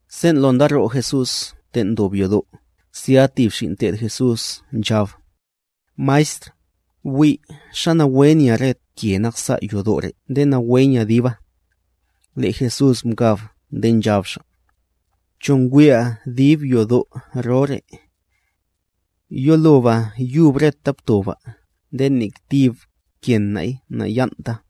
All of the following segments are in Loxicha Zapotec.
Sen' lo ndaro' Jesús ten' ndob yodo', zya tib xin' te'd Jesús nchab: —¡Maestr, bwi' xa nawe nya re ke naksa' yodo' re' nde nawe nya diba! Le' Jesús mkab nde nchab Xa': —¿Cho ngwi'a dib yodo' ro re'? Yoloba yub reta ptoba nde nek tib kenay naya'nta.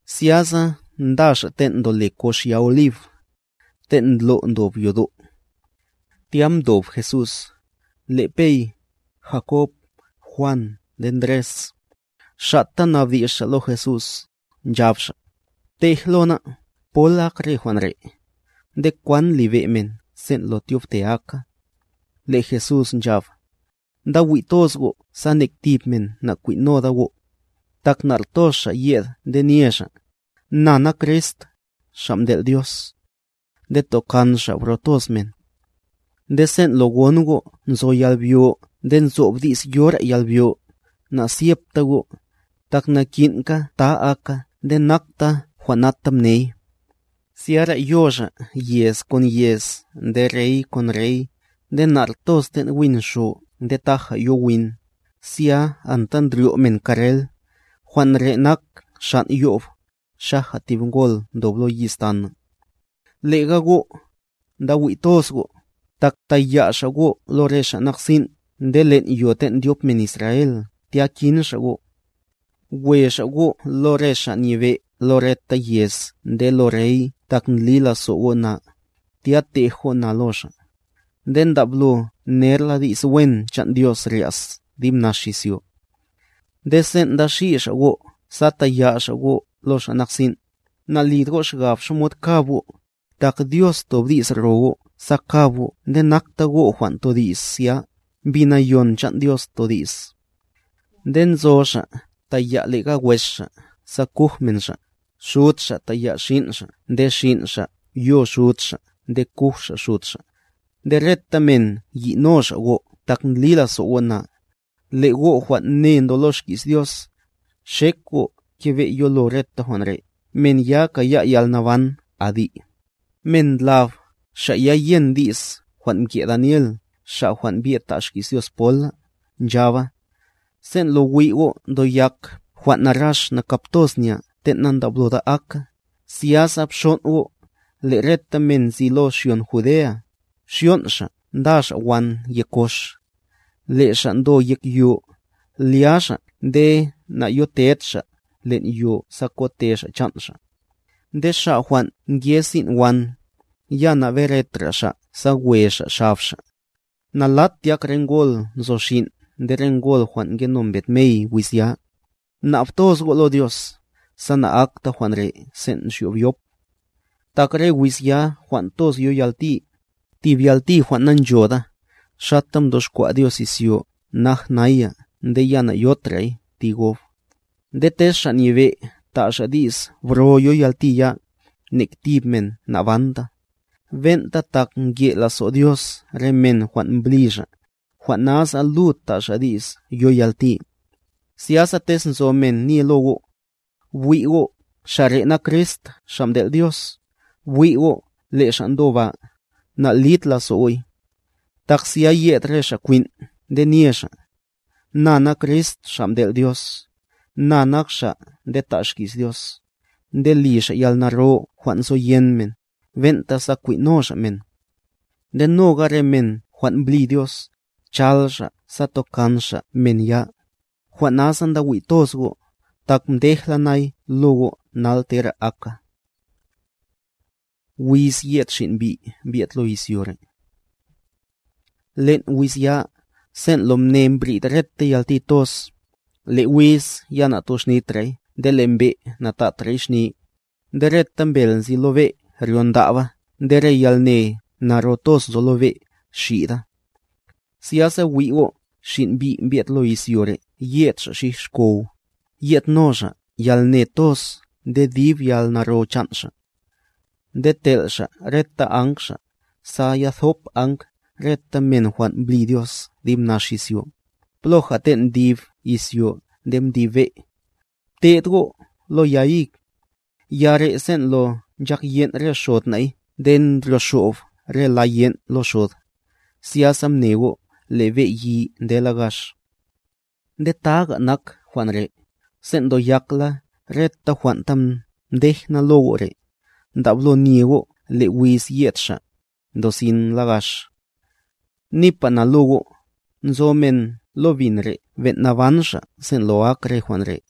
Zyasa nda xa' ten' ndole kox ya Olib, ten' ndlo' ndob yodo'. Tya mdob Jesús, le' Pey, Jakob, Juan nde Ndres, xa'ta mnabdi's xa' lo Jesús, nchab xa': —Btej lo ná'. ¿Pol ak re jwan' re'? ¿Nde kwan libe' men sen' lo tyobte aka? Le' Jesús nchab: —Nda wi' toz go' sa nek tib men nakwin'noda go'. Tak nar toz xa' yed nde nye xa': “Na nak Crist, Xa' mtel' Dios”. Nde tokan xa' bro toz men. Nde sen' lo gon go' nzo yalbyo nde nzob di's yora yalbyo, nazyepta go', tak naki'nka ta aka nde nakta jwan' nata mney. Zyara yo xa', yez kon yez nde rey kon rey; nde nar toz ten' win xo nde taja yo win, zya anta ndryo' men karrel, jwan' re nak xan' yo'b, xaja tib ngol ndob lo yiz tana. Lega go', nda wi' toz go', tak taya' xa' go' lo re xa' nak sin' nde len' yo ten' ndyop men Israel tya kin xa' go'. We xa' go' lo re xa' nyebe' lo reta yez nde lo rey tak ndli lazo' go' na, tya tej go' na lo xa'. Nde ndablo nerla di's wen chan' Dios rya's dib nax izyo. Nde sen' nda xi' xa' go' sa taya' xa' go' lo xa' nak sin', nalit go' xgab xamod kab go', tak Dios tob di's ro go' sa kab go' nde nakta go' jwan' todi's zya, Mbi Nayon chan' Dios todi's. Nde nzo xa' taya' lega wes xa' sa kuj men xa', xud xa' taya' xin' xa' nde xin' xa' yo xud xa' nde kuj xa' xud xa'. Nde reta men yi'no xa' go' tak ndli lazo' go' na. Le' go' jwan' ne ndo lo xki's Dios, xek go' kebe' yolo reta jwan' re', men ya kaya' yalnaban adi'. Men ndlab, xa' ya yen di's jwan' mke' Daniel xa' jwan' mbye'd ta' xki's Dios pola,a nchaba:b “Sen' lo wi' go' ndoyak jwan' narax nakap toz nya ten' nandabloda aka”,c zyasa bxon' go', le' reta men nzi lo xyon Judea, xyon' xa' nda xa' wan yek kox. Le' xa' ndo yek yo, lya xa' nde nayoted xa' len' yo sa kote xa' chan' xa'. Nde xa' jwan' nke sin' wan, ya naberetra xa' sa we xa' xab xa'. Nalat tyák re ngol nzo xin' nde re ngol jwan' ngeno mbed mey wiz ya. Mnab toz go' lo Dios, sa na'akta jwan' re' sen' nxyob yop. Tak re wiz ya jwan' toz yo yalti, tib yalti jwan' nanchoda, xata mtoxkwa' Dios izyo naj naya nde ya nayotray ti gob. Nde tez Xa' Nyebe' ta' xa' di's bro yo yalti ya, nek tib men nabanta; ben'ta tak nke' lazo' Dios re men jwan' mbli Xa', jwan' nasa lud ta' Xa' di's yo yalti. Zyasa tez nzo men nye lo go': “Bwi' go', xa' re' nak Crist xa' mtel' Dios”, “Bwi' go', le' Xa' ndo ba”, nalid lazo' go'y. Tak zya yed re xa' kwin' nde nye xa': “Na nak Crist xa' mtel' Dios”, “Na nak xa' nde ta' xki's Dios”d nde li xa' yalnaro jwan' nzoyen men, ben'ta sa kwin' no xa' men. Nde noga re men jwan' mbli Dios, chal xa' sa tokan xa' men ya. Jwan' nasa nda wi' toz go'; tak mdej la nay lo go' nal tera aka. Wiz yed Xin' Mbi' mbye'd lo izyo re' Len' wiz ya, sen' lo mne mbrid reta yalti toz, le' wiz ya natoxnitray nde le' mbe' natatray xni, nde reta mbel nzi lo be' ryondaba nde re yalne naro toz nzo lo be', xida. Zyasa wi' go', Xin' Mbi' mbye'd lo izyo re' yed Xa' xij xkow, yedno Xa' yalne toz nde dib yalnaro chan' Xa'. Nde tel' Xa' reta Áng Xa', sa ya thop Áng reta men jwan' mbli Dios dib nax izyo, ploja ten' mdib izyo nde mdib be'. Bte'd go' lo ya hig: Ya re' sen' lo nchak yen' re xod na'y nde ndryoxob re la yen' lo xod, zyasa mne go' le' be' yi ndela gax. Nde taga nak jwan' re', sen' ndoyakla reta jwan' ta mdej na lo go' re', ndablo nye go' le' wiz yed Xa', ndosin la gax. Nipa na lo go', nzo men lo bin re' ben' naban xa' sen' lo ak re jwan' re'.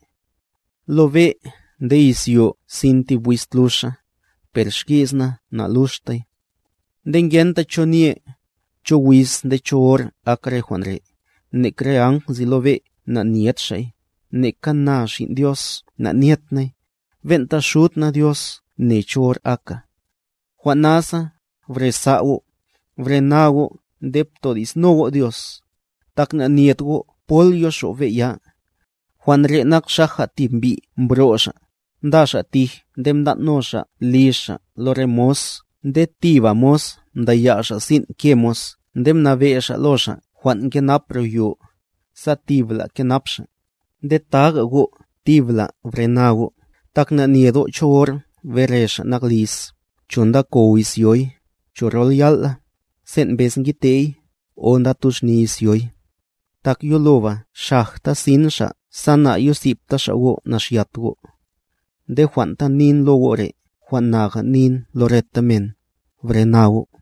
Lo be' nde izyo sin tib wiz tluxa, per xki's na naluxtay. Nde ngenta cho nye, cho wiz nde cho hor ak re jwan' re', nek re áng nzi lo be', neka na Xin' Dios, ben'ta Xud na Dios mney. Jwan' nasa, bresa' go', brena go' nde ptodi'sno go' Dios; tak nanyet go' pol yoxob be' ya. Jwan' re' nak xaja tib mbi' mbro' xa', nda xa' tij nde mtan' no xa' liz xa' lo re mos nde tiba mos mdaya' xa' sin' ke mos nde mnabe' xa' lo xa' jwan' nkenap ro yo, sa tibla kenap xa'. Nde taga go', tibla brena go', tak nanyet go' cho hor bere xa' nak liz; cho ndakow izyoy, cho rol yal' la, sen' mbez ngidte'y, o ndatuxni izyoy. Tak yoloba xajta sin xa' sa na'yosibta xa' go' naxyat go'. Nde jwan' ta nin lo go' re', jwan' naga nin lo reta men: Brena go'.